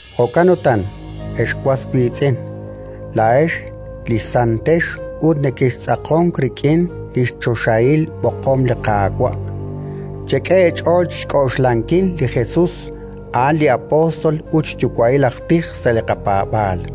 Jo'kan utan, ex was wiitz'in, laa'ex li santex ut nekextz'aqonk rik'in li xchoxahil b'oqom li Qaawa', chek'e eech'ool chi xk'oxlankil li Jesus, a'an li apóstol ut xyuwa'il aj tij sa' li qapaab'aal.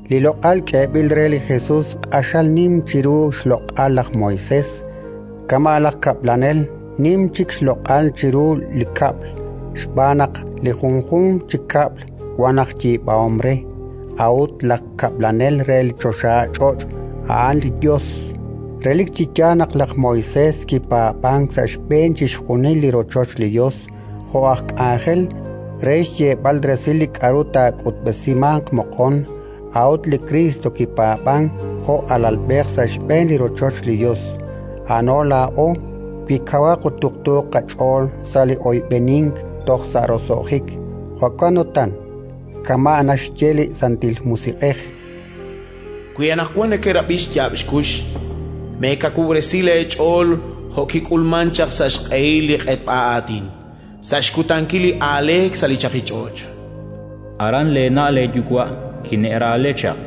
Li loq'al k'eeb'il re li Jesus q'axal nim chiru li xloq'al laj Moisés: kama' laj kab'lanel nim chik xloq'al chiru li kab'l. Xb'aan naq li junjunq chi kab'l wank aj yiib'ahom re; a'ut laj kab'lanel re li choxach'och' a'an li Yos. Relik chi yaal naq laj Moisés kipaab'ank sa' xb'een chixjunil li rochoch li Yos jo' aj k'anjel, re xyeeb'al resil li k'aru taak'utb'esimanq moqon. A'ut li Kriist kipaab'ank jo' alalb'ej sa' xb'een li rochoch li Yos, a'ano laa'o, wi kawaq ut tuqtuuq qach'ool sa' li oyb'enink toj sa' roso'jik. Jo'kan utan, kama' naxye li Santil Musiq'ej: “Wi anaqwan nekerab'i xyaab' xkux, meekawub'resi leech'ool jo' kik'ulmank chaq sa' xq'ehil li q'etb'a aatin, sa' xkutankil li aaleek sa' li chaqich'och'. Aran leena' leeyuwa' kine'raale chaq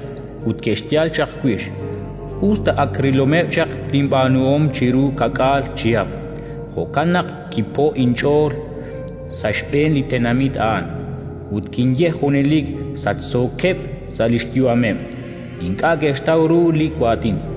ut ke'xyal chaq wix, us ta ak rilomeb' chaq linb'aanuhom chiru ka'k'aal chihab'. Jo'kan naq kipo'k inch'ool sa' xb'een li tenamit a'an ut kinye: «Junelik sachsookeb' sa' li xyu'ameb', ink'a' ke'xtaw ru li waatin».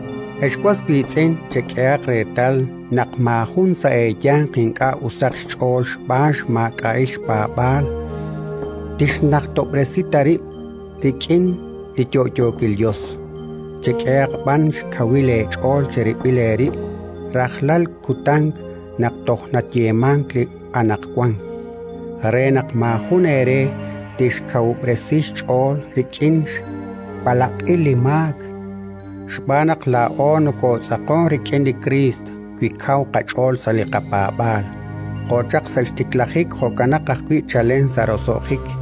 Ex was wiitz'in, chek'ehaq reetal naq maajun sa' eeyanq ink'a' usaq xch'ool xb'aan xmaak'a'il xpaab'aal tixnajtob'resi ta rib' rik'in li yo'yookil Yos. Chek'ehaq b'an xkawub' eech'ool cherib'il eerib' rajlal kutan naq toj nayeemank li “anaqwan”, re naq maajun eere tixkawub'resi xch'ool rik'in xb'alaq'il li maak. Xb'aan naq laa'o nokootz'aqonk rik'in li Kriist wi kaw qach'ool sa' li qapaab'aal, jo' chaq sa' xtiklajik jo'kanaq ajwi' chalen sa' roso'jik.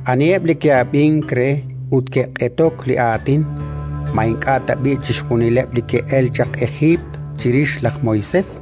Aniheb' li ke'ab'ink re ut ke'q'etok li aatin? Ma ink'a' tab'i' chixjunileb' li ke'elk chaq Ejiipt chirix laj Moisés?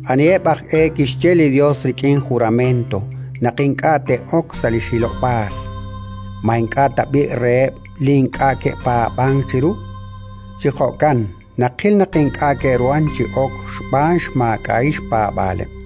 Aniheb' aj e kixye li Yos rik'in jurament naq ink'a' te'ok sa' li xhilob'aal? Ma ink'a' tab'i' reheb' li ink'a' ke'paab'ank chiru? Chi jo'kan naqil naq ink'a' ke'ruhank chi ok xb'aan xmaak'a'il xpaab'aaleb'.